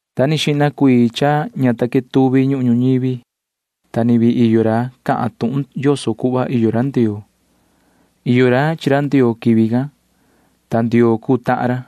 Nda ni xihna cuii ña ta quetuvi ñuhun ñuñivi, ta ni vii iyo ra cahan tuhun yoso cuhva iyo ra Ndioo. Iyo ra chi ra Ndioo quivi can, ta Ndioo cuu tahan ra.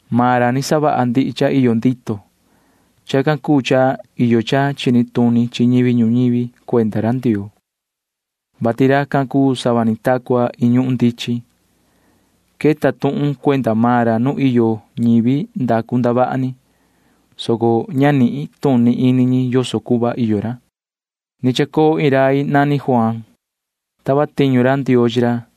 Maan ra ni savaha cha iyo ndito ndihi cuii cha iyo. Chacan cuu cha iyo cha chini tuni chi ñivi ñuñivi cuenda ra Ndioo, vati racan cuu sava ni ta cua iin ñuhun ndichin. Queta tuhun cuenda maan ra nu iyo ñivi ndacu ndavaha ni, soco ña nituni ini ñi yoso cuhva iyo ra. Ni chacoo iin rai nani Juaan. Tava tiñu ra Ndioo chi ra,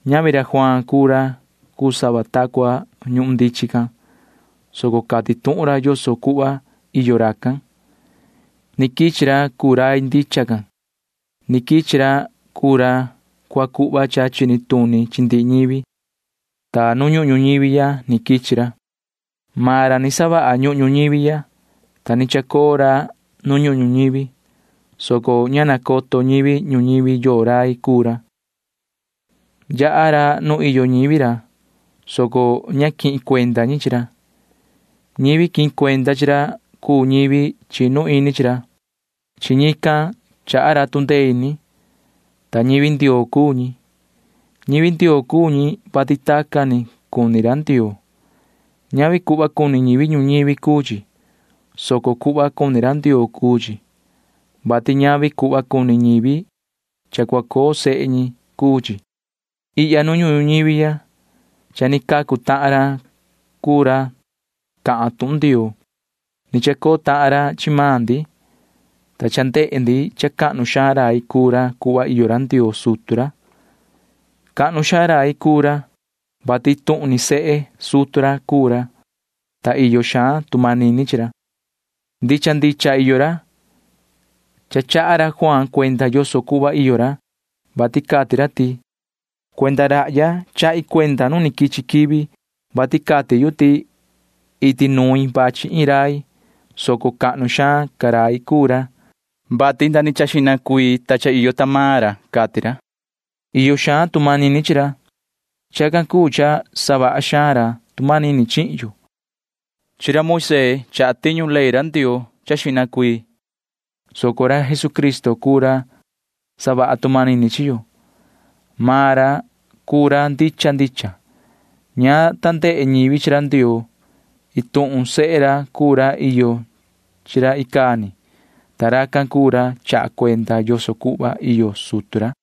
Ñavi ra Juaan cuu ra cuu sava ta cua ñuhun ndichin can, soco maan ra cati tuhun ra yoso cuhva iyo racan. Ni quichi ra cuu rai ndicha can. Ni quichi ra cuu ra cua cuhva cha chini tuni chi ndihi ñivi, ta nu ñuhun ñuñivi ya ni quichi ra. Maan ra ni savaha ñuhun ñuñivi ya, ta ni chacoo ra nu ñuhun ñuñivi, soco ña nacoto ñivi ñuñivi yoo rai cuu ra. Yaha ra nu iyo ñivi ra, soco ña quihin cuenda ñi chi ra. Ñivi quihin cuenda chi ra cuu ñivi chinu ini chi ra. Chi ñican chaha ra tu ndee ini, ta ñivi Ndioo cuu ñi. Ñivi Ndioo cuu ñi, vati tacan ni cuni ra Ndioo. Ñavi cuhva cuni ñivi ñuñivi cuu chi, soco cuhva cuni ra Ndioo cuu chi, vati ñavi cuhva cuni ñivi cha cua coo sehe ñi cuu chi. Ihya nu ñuhun ñuñivi ya cha ni cacu tahan ra cuu ra cahan tuhun Ndioo. Ni chacoo tahan ra chi maan ndi, ta cha ndehe ndi cha cahnu xaan rai cuu ra cuhva iyo ra Ndioo sutu ra. Cahnu xaan rai cuu ra, vati iin tuhun ni sehe sutu ra cuu ra, ta iyo xaan tu manini chi ra. Ndicha ndicha iyo ra. Cha chaha ra Juaan cuenda yoso cuhva iyo ra, vati cati ra ti: ―Cuenda rahya chahi cuenda nu quichi quivi, vati cati yu ti iti nuin vachi iin rai, soco cahnu xaan ca rai cuu maan ra, vati xihna cuii ca cha ni iyo ra ―cati ra. Iyo xaan tu manini chi ra. Chacan cuu cha savaha xaan ra tu manini chi maan yo. Moisee cuu ra ni sayaha ley Ndioo cha xihna cuii, soco ra Jesucristo cuu ra savaha tu manini chi yo. Maan ra cuu ra ndicha ndicha. Ña ta ndehe ñivi chi ra Ndioo. Iin tuhun sehe ra cuu ra iyo chi ra icaa ni, ta racan cuu ra chaha cuenda yoso cuhva iyo sutu ra.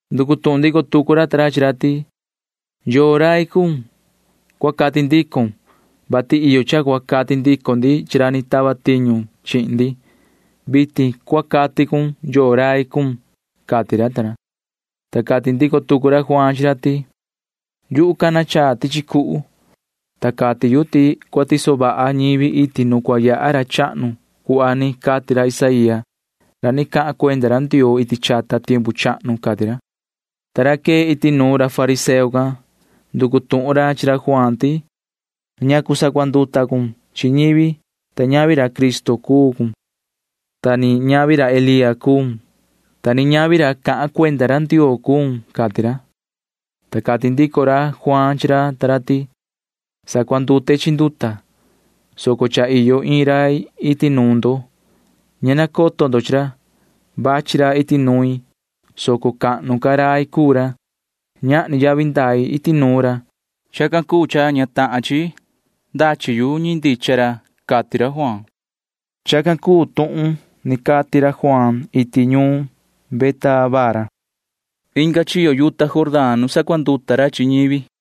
Nducu tuhun ndico tucu ra ta ra chi ra ti: ―¿Yoo rai cuun? Cua cati ndicon, vati iyo cha cua cati ndico ndi chi ra ni tava tiñu chihin ndi. Vitin cua cati cun yoo rai cuun ―cati ra ta ra. Ta cati ndico tucu ra Juaan chi ra ti: ―Yuhu cana chaa tichi cuhu, ta cati yu ti cua tiso vaha ñivi iti nu cua yaha ra chahnu cuhva ni cati ra Isaía ra ni cahan cuenda ra Ndioo iti chata tiempu chahnu ―cati ra. Ta ra quee iti nuun ra fariseo can nducu tuhun ra chi ra Juaan ti: ―¿Ñacu sacuanduta cun chi ñivi, vati ñavi ra Cristo cuun, ta ni ñavi ra Elía cuun, ta ni ñavi ra cahan cuenda ra Ndioo cuun? ―cati ra. Ta cati ndico ra Juaan chi ra ta ra ti: ―Sacuandute chi nduta, soco cha iyo iin rai iti nuun ndo―ña nacoto ndo chi ra. Vachi ra iti nuin, [soco cahnu ca rai cuu ra]. Ñahni yavi ndai iti nuun ra. Chacan cuu cha ña cuu cunda tohi, ta ndachi yu tiendu ndichan ra ―cati ra Juaan. Chacan cuu tuhun ni cati ra Juaan iti ñuun Betábara inga chiyo yuta Jordán nu sacuanduta ra chi ñivi.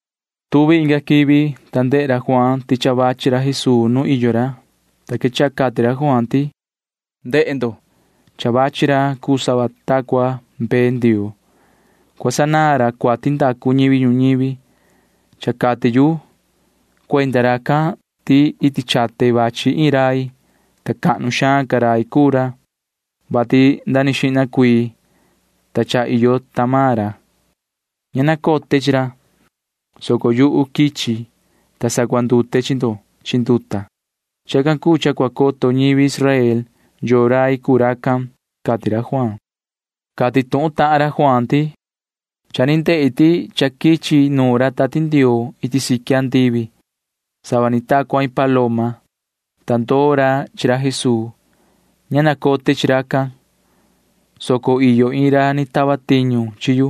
Tuvi inga quivi, ta ndehe ra Juaan ti cha vachi ra Jesuu nu iyo ra, ta quechaha cati ra Juaan ti: ―¡Jihna! Cha vachi ra cuu sava ta cua mbee Ndioo. Cua sanaan ra cuati ndacu ñivi ñuñivi. Cha cati yu cuenda racan ti iti nuin vachi iin rai, ta cahnu xaan ca rai cuu ra, vati nda ni xihna ca cha iyo ra. Ña nacote chi ra, soco yuhu quichi, ta sacuandute chi ndo chi nduta. Chacan cuu cha cua coto ñivi Israel yoo rai cuu racan ―cati ra Juaan. Cati tuhun tahan ra Juaan ti: ―Cha ni ndehi ti cha quichi nuun ra Tati Ndioo iti siqui andivi cuhva quichi nuun iin ri paloma, ta ndoo ra chi ra Jesuu. Ña nacote chi racan, soco iyo iin ra ni tava tiñu chi yu,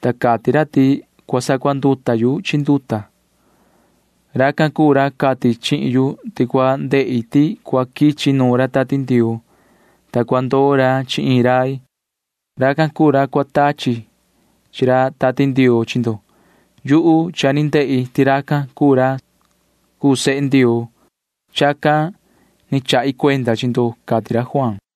ta cati ra ti cua sacuanduta yu chi nduta. Racan cuu ra cati chihin yu ti cua ndehi ti cua quichi nuun ra Tati Ndioo, ta cua ndoo ra chi iin rai. Racan cuu ra cua tachi chi ra Tati Ndioo chi ndo. Yuhu cha ni ndehi ti racan cuu ra cuu sehe Ndioo. Chacan ni chahi cuenda chi ndo ―cati ra Juaan.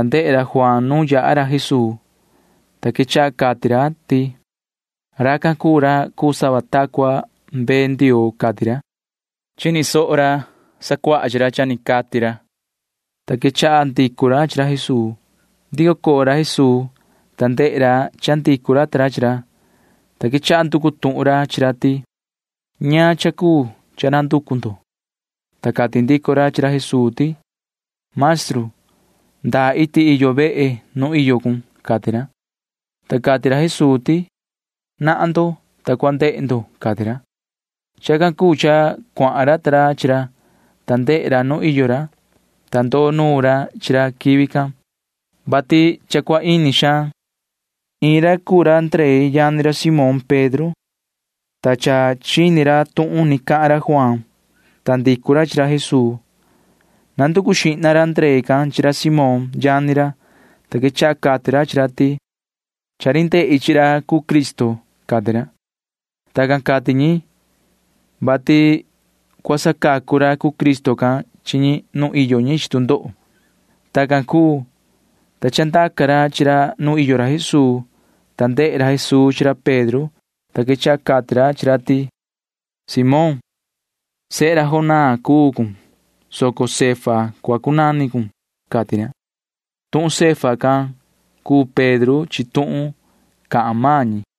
ta ndehe ra Juaan nu yaha ra Jesuu, ta quechaha cati ra ti: ―Racan cuu ra cuu sava ta cua mbee Ndioo ―cati ra. Chini soho ra chica chi ra cha ni cati ra, ta quechaha ndicu ra chi ra Jesuu. Ndico coo ra Jesuu, ta ndehe ra cha ndicu ra ta ra chi ra, ta quechaha nducu tuhun ra chi ra ti: ―¿Ñaan cha cuu cha nanducu ndo? Ta cati ndico ra chi ra Jesuu ti: ―Maestru, ¿ndaa iti iyo vehe nu iyo cun? ―cati ra. Ta cati ra Jesuu ti: ―Nahan ndo, ta cua ndehe ndo ―cati ra. Chacan cuu cha cuahan ra ta ra chi ra, ta ndehe ra nu iyo ra, ta ndoo nuun ra chi ra quivi can, vati cha cua ini xaan. Iin ra cuu ra Ndree yani ra Simón Pedro, ta cha chini ra tuhun ni cahan ra Juaan, ta ndicu ra chi ra Jesuu. Nanducu xihna ra Ndree can chi ra Simón yani ra, ta quechaha cati ra chi ra ti: ―Cha ni ndehe ndi chi ra cuu Cristo ―cati ra. [Tacan cati ñi, vati cua sacacu ra cuu Cristo can chi ñi nu iyo ñi chi tu ndoho.] Tacan cuu, ta ni chandaca ra chi ra nu iyo ra Jesuu, ta ndehe ra Jesuu chi ra Pedro, ta quechaha cati ra chi ra ti: ―Simón, sehe Jonaa cuun, soco Cefa cua cunani cun ―cati ra. Tuhun Cefa can cuu Pedro chi tuhun cahan maan ñi.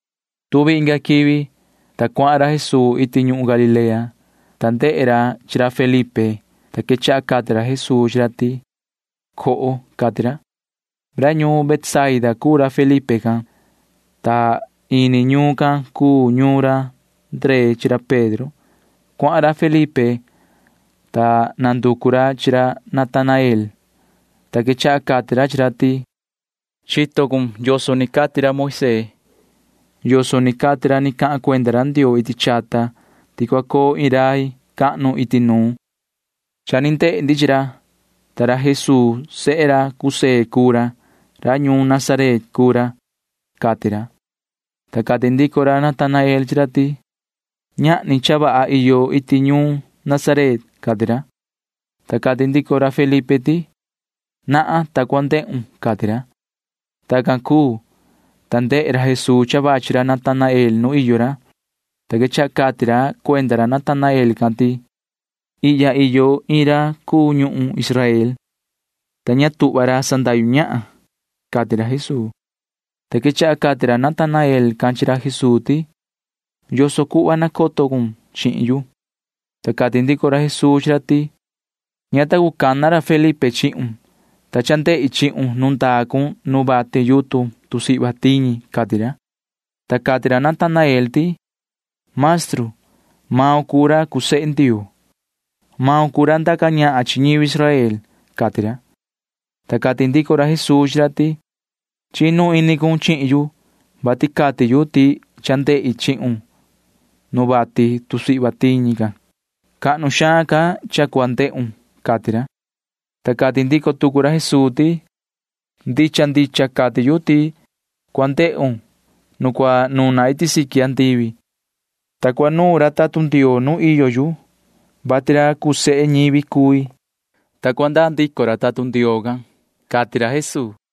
Tuvi inga quivi, ta cuni cuhun ra Jesuu iti ñuhun Galilea, ta ndehe ra chi ra Felipe, ta quechaha cati ra Jesuu chi ra ti: ―Na coho ―cati ra. Ra ñuun Betsaida cuu ra Felipe can, ta ini ñuun can cuu ñuun ra Ndree chi ra Pedro. Cuahan ra Felipe, ta nanducu ra chi ra Natanael, ta quechaha cati ra chi ra ti: ―Chito cun yoso ni cati ra Moisee yoso ni cati ra ni cahan cuenda ra Ndioo iti chata ti cua coo iin rai cahnu iti nuun. Cha ni ndehe ndi chi ra, ta Jesuu sehe José cuu ra. Ra ñuun Nazaret cuu ra ―cati ra. Ta cati ndico ra Natanael chi ra ti: ―Ña ta ñahni cha vaha cha iyo iti ñuun Nazaret ―cati ra. Ta cati ndico ra Felipe ti: ―Nahan, ta cua ndehun ―cati ra. Tacan cuu, ta ndehe ra Jesuu cha vachi ra Natanael nu iyo ra, ta quechaha cati ra cuenda ra Natanael can ti: ―Ihya iyo iin ra ndicha ñuhun Israel, ta ña tuhva ra sandahyu ñahan ra ―cati ra Jesuu. Ta quechaha cati ra Natanael can chi ra Jesuu ti: ―¿Yoso cuhva nacoto cun chihin yu? Ta cati ndico ra Jesuu chi ra ti: ―Ña ta cana ra Felipe chihun. Ni vii iyo cun nu vati yutun tusihva ican, ta ndehi chihun ―cati ra. Ta cati ra Natanael ti: ―Maestru, maun cuu ra cuu sehe Ndioo. Maun cuu ra ndaca ñahan chi ñivi Israel ―cati ra. Ta cati ndico ra Jesuu chi ra ti: ―Chinu ini cun chihin yu, vati cati yu ti cha ndehi chihun nu vati can. Cahnu xaan ca cha cua ndehun ―cati ra. Ni vii cati ra Jesuu chi ra: ―Ndicha ndicha cati yu ti cua ndehun nu cua nuna iti siqui andivi, ta cua nuun ra tatun Ndioo nu iyo yu, vati ra cuu sehe ñivi cui, ta cua ndaa ndico ra tatun Ndioo can ―cati ra Jesuu.